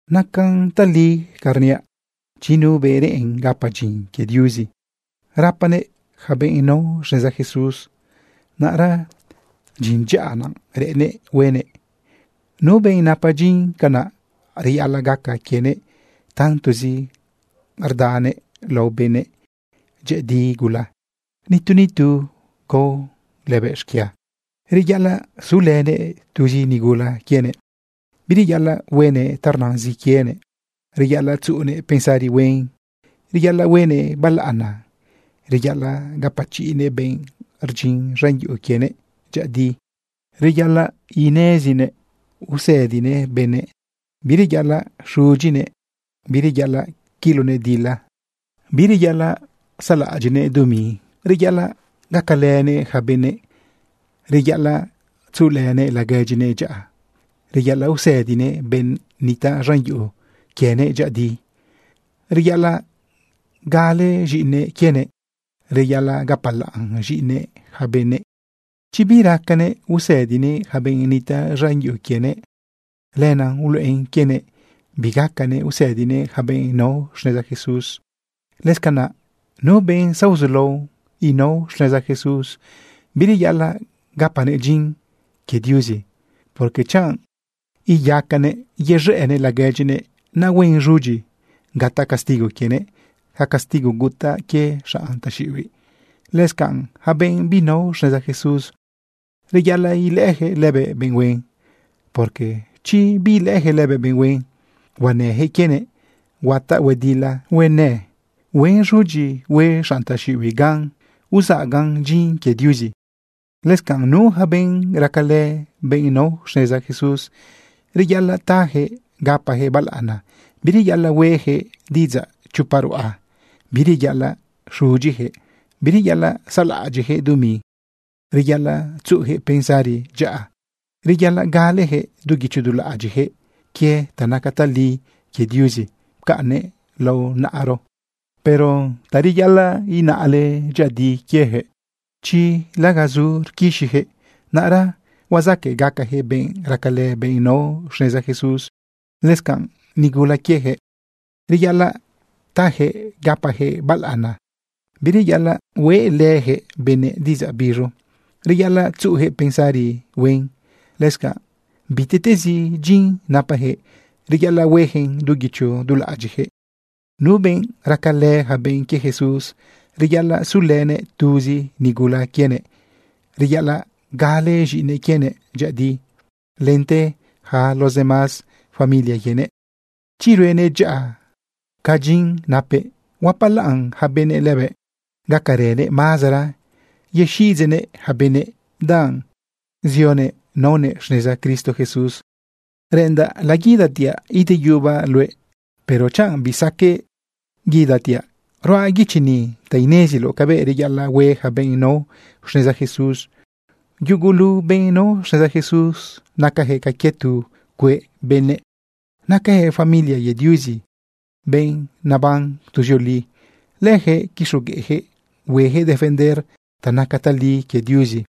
Nacan tali ca rniaꞌ. Chi nu benꞌ reꞌen gapa dyin quie Diuzi rapanëꞌ yaca benꞌ nao xneza Jesús, naꞌra dyin dyaꞌa naꞌ reꞌennëꞌ huenëꞌ. Nu benꞌ napa dyin canaꞌ, reyaꞌalaꞌ gaca quienëꞌ tantozi rdanëꞌ lao benëꞌ dyëꞌëdi gula, nitu nitu gao lëbëꞌ xquia. Reyaꞌalaꞌ sulënëꞌ tuzi nigula quienëꞌ. Bireyaꞌalaꞌ huenëꞌ ta rnazin quienëꞌ. Reyaꞌalaꞌ tzuꞌunëꞌ pensari huen, reyaꞌalaꞌ huenëꞌ balaꞌana. Reyaꞌalaꞌ gapachiꞌnëꞌ benꞌ rdyin z̃an yuꞌu quienëꞌ dyëꞌëdi. Reyaꞌalaꞌ nezinëꞌ usëdinëꞌ benëꞌ. Bireyaꞌalaꞌ xudyinëꞌ. Bireyaꞌalaꞌ quilonëꞌ dila. Bireyaꞌalaꞌ saꞌlaꞌadyiꞌnëꞌ dumi. Reyaꞌalaꞌ gacalënëꞌ yaca benëꞌ. Reyaꞌalaꞌ tzuꞌulënëꞌ laguedyinëꞌ dyaꞌa. Reyaꞌalaꞌ usëdinëꞌ benꞌ nitaꞌ z̃an yuꞌu quienëꞌ dyëꞌëdi. Reyaꞌalaꞌ gale z̃iꞌinëꞌ quienëꞌ. Reyaꞌalaꞌ gapalaꞌn z̃iꞌinëꞌ yaca benëꞌ. Chi biracanëꞌ usëdinëꞌ yaca benꞌ nitaꞌ z̃an yuꞌu quienëꞌ, lenaꞌ uluꞌen quienëꞌ bigacanëꞌ usëdinëꞌ yaca benꞌ nao xneza Jesús. Lëscanaꞌ nu benꞌ zaozulao inao xneza Jesús, bireyaꞌalaꞌ gapanëꞌ dyin quie Diuzi, porque chanꞌ iyaquëꞌ yez̃ëꞌnëꞌ laguedyinëꞌ, naꞌ huen z̃udyi gataꞌ castigo quienëꞌ ca castigo gutaꞌ quie xanꞌ taxiꞌibiꞌ. Lëscanꞌ yaca benꞌ binao xneza Jesús, reyaꞌalaꞌ ilëꞌëyaquëꞌ lëbëꞌ benꞌ huen, porque chi biilëꞌëyaquëꞌ lëbëꞌ benꞌ huen, huanëyaquëꞌ quienëꞌ, huataꞌ huedila huenë, huen z̃udyi hue xanꞌ taxiꞌibiꞌ gan uzaꞌagan dyin quie Diuzi. Lëscanꞌ nu yaca benꞌ racalë benꞌ nao xneza Jesús, reyaꞌalaꞌ tajëꞌ gapajëꞌ balaꞌana. Bireyaꞌalaꞌ huejëꞌ diꞌidzaꞌ chopa ruꞌa. Bireyaꞌalaꞌ xudyiyaquëꞌ. Bireyaꞌalaꞌ saꞌlaꞌadyiꞌyaquëꞌ dumi. Reyaꞌalaꞌ tzuꞌuyaquëꞌ pensari dyaꞌa. Reyaꞌalaꞌ galeyaquëꞌ du guicho du laꞌadyiꞌyaquëꞌ quie ta naca tali quie Diuzi pcaꞌnnëꞌ lao naꞌaro. Pero zareyaꞌalaꞌ inaꞌle dyëꞌëdi quieyaquëꞌ, chi lagazu rquixiyaquëꞌ, naꞌra huazaqueꞌ gacayaquëꞌ benꞌ racalë benꞌ nao xneza Jesús. Lëscanꞌ nigula quieyaquëꞌ, reyaꞌalaꞌ tajëꞌ gapajëꞌ balaꞌana. Bireyaꞌalaꞌ hueꞌlëyaquëꞌ yaca benëꞌ diꞌidzaꞌ biz̃u. Reyaꞌalaꞌ tzuꞌuyaquëꞌ pensari huen. Lëscanꞌ bitiꞌtezi dyin napayaquëꞌ, reyaꞌalaꞌ hueyaquëꞌn du guicho du laꞌadyiꞌyaquëꞌ. Nu benꞌ racalë yaca benꞌ quie Jesús, reyaꞌalaꞌ sulënëꞌ tuzi nigula quienëꞌ. Reyaꞌalaꞌ gale z̃iꞌinëꞌ quienëꞌ dyëꞌëdi lente yaca los demás familia quienëꞌ. Chi ruenëꞌ dyaꞌa ca dyin napëꞌ, huapalaꞌn yaca benëꞌ lëbëꞌ, gacaranëꞌ mazara yexiꞌidzeꞌnëꞌ yaca benëꞌ, danꞌ zionëꞌ naonëꞌ xneza Cristo Jesús. Reꞌendaꞌ laguidatiaꞌ ideyubaꞌ luëꞌ, pero chanꞌ bisaqueꞌ guidatiaꞌ, ruaꞌ guichi ni ta ineziloꞌ cabëꞌ reyaꞌalaꞌ hue yaca benꞌ nao xneza Jesús. Yugulu benꞌ nao xneza Jesús nacayaquëꞌ ca quie tu cueꞌ benëꞌ. Nacayaquëꞌ familia quie Diuzi, benꞌ neban tuzioli. Leyaquëꞌ quixogueꞌyaquëꞌ hueyaquëꞌ defender ta naca tali quie Diuzi.